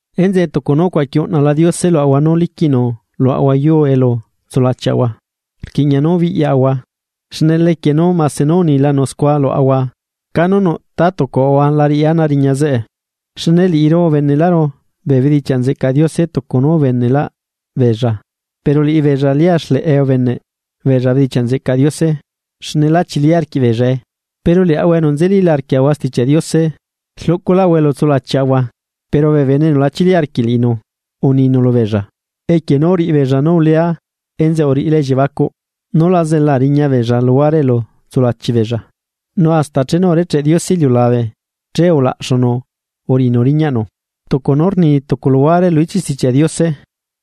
Enzeꞌe, tucu nú ucuaqui uꞌnala Diose luaꞌahua nú liquiꞌnu luaꞌahua yuu elu tsulachiaꞌahua, rquiꞌña nú biꞌyahua, xne lequie nú mase nú unilanu scua luaꞌahua canu nuꞌ ta tucuꞌahua la riꞌi ana riña zeꞌe. Xne liꞌiru ubeneꞌlaꞌru bee bedichiaꞌ nzeꞌcaꞌ Diose tucu nú ubeneꞌlaꞌ beella, pero liꞌibeella lia xleꞌe ubeneꞌ beella bedichiaꞌ nzeꞌcaꞌ Diose, xne lá chili arquiꞌ beellae. Pero liaꞌahua enu nzelíla arquiaꞌahua Stichiaꞌ Diose, rluꞌculaꞌahua elu tsulachiaꞌahua, pero bee bene enu la chili arquiꞌ liꞌinu, uninu lubeella: Equie nú uriꞌi beella nú ulea enzeꞌe uriꞌilá elliebacuꞌ, nú la zela riña beella luguare elu tsulachi beella. Nu hasta chenu urecheꞌ Diose iliulabe che ulaꞌxunu uriꞌinu riñaꞌnu. Tucu nú rni tucu luhuare lu ichiꞌ Stichiaꞌ Diose,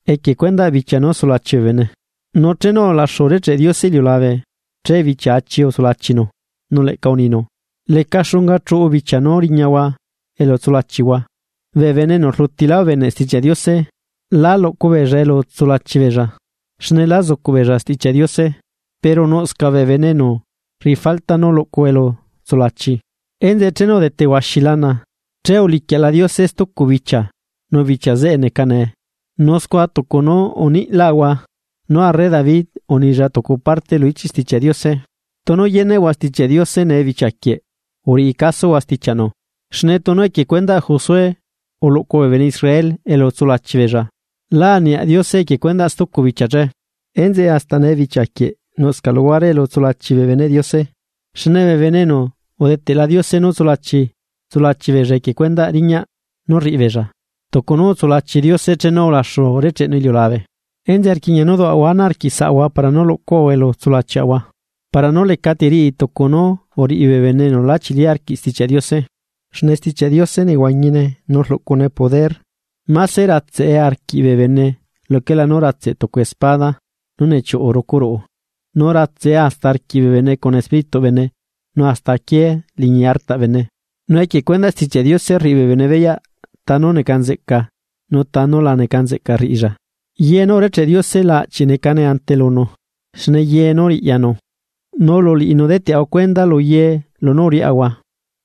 equie cuendaꞌ bichia nú sulachi bee bene: Nu chenu ulaxu urecheꞌ Diose iliulabe che bichia achi utsulachinu. Nu leꞌca uninu: Leca xunga chuꞌu bichia nú riñahua elu tsulachihua. Bee bene enu rlutilá ubeneꞌ Stichiaꞌ Diose, lá luꞌcu beella elu tsulachi beella, xne lá zucuꞌ beella Stichiaꞌ Diose, pero nuꞌscaꞌ bee bene enu rriꞌi falta nú luꞌcu elu tsulachi. Enzeꞌe chenu udete huaxi lana, che uliquiaꞌla Diose stucu bichia nu bichia zeꞌe neca nee. Nu scua tucu nú uniꞌlaꞌahua. Nú arre David unilla tucu parte lu ichiꞌ Stichiaꞌ Diose: Tunu yeneꞌhua Stichiaꞌ Diose nee bichia quieꞌ, uriꞌi casuhua stichiaꞌnu. Xne tunu equie cuendaꞌ Josué uluꞌcu bee bene Israel elu tsulachi beella, lá aniaꞌ Diose equie cuendaꞌ stucu bichia che. Enzeꞌe hasta nee bichia quieꞌ nuꞌscaꞌ luhuare elu tsulachi bee beneꞌ Diose. Xne bee bene enu udeteꞌla Diose nú tsulachi, tsulachi beella equie cuendaꞌ riñaꞌ nú rriꞌi beella, tucu nú utsulachi Diose chenu ulaxu urecheꞌnu iliulabe. Enzeꞌe rquiꞌña nú duaꞌahua ana arquiꞌsaꞌahua para nú luꞌcuaꞌahua elu tsulachiaꞌahua, para nú lecati riꞌi tucu nú uriꞌi bee bene enu lá chili arquiꞌ Stichiaꞌ Diose. Xne Stichiaꞌ Diose nehuañine nu rluꞌcune poder. Máse ratseꞌe arquiꞌ bee bene luquela nú ratseꞌ tucu espada nú nechiuꞌu rucu ruꞌu, nu ratseꞌe hasta arquiꞌ bee bene cuna Espírituꞌ bene nu hasta aquié liñi artaꞌ bene, nu equie cuendaꞌ Stichiaꞌ Diose rriꞌi bene beyaꞌ tanú neca nzeꞌca nu tanú la neca nzeꞌca rriꞌilla. Ye nú urecheꞌ Diose la aꞌchiꞌ necane ante lunu, xne ye nú riꞌyanu, nu lu liꞌinu deteꞌahua cuenda lu ye lunú uriaꞌahua.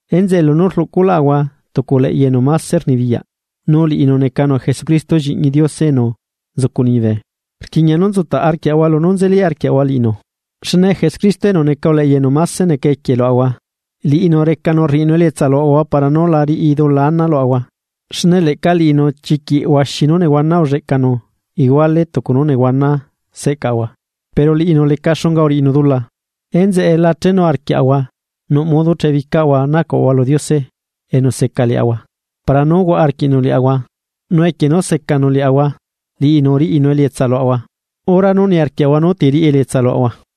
Enzeꞌe lunú rluꞌculaꞌahua tucu uleꞌya enu máse rnibiyaꞌ, nu liꞌinu necanu Jesucristo lliꞌñi Diose enu nzucu liñibe, rquiꞌña nú nzutaꞌ arquiaꞌahua lunú nzeli arquiaꞌahua liꞌinu. Xne Jesucristo enu neca uleꞌya enu máse neca equie luaꞌahua, liꞌinu recanu rriꞌinu elietsa luaꞌahua para nú la riꞌi dula ana luaꞌahua. Xne leꞌca liꞌinu chiquiꞌ huaxi nú nehuana ulleꞌcanu iguale tucu nú nehuana seꞌcaꞌahua, pero liꞌinu leca xunga uriꞌinu dula. Enzeꞌe, la chenu arquiaꞌahua nuꞌ modo chebicaꞌahua nacuaꞌahua lu Diose enu seca liaꞌahua, para nú huaꞌa arquiꞌnu liaꞌahua. Nu equie nú secanu liaꞌahua, liꞌinu riꞌinu elietsa luaꞌahua, hora nú niarquiaꞌahua nú ti riꞌi elietsa luaꞌahua.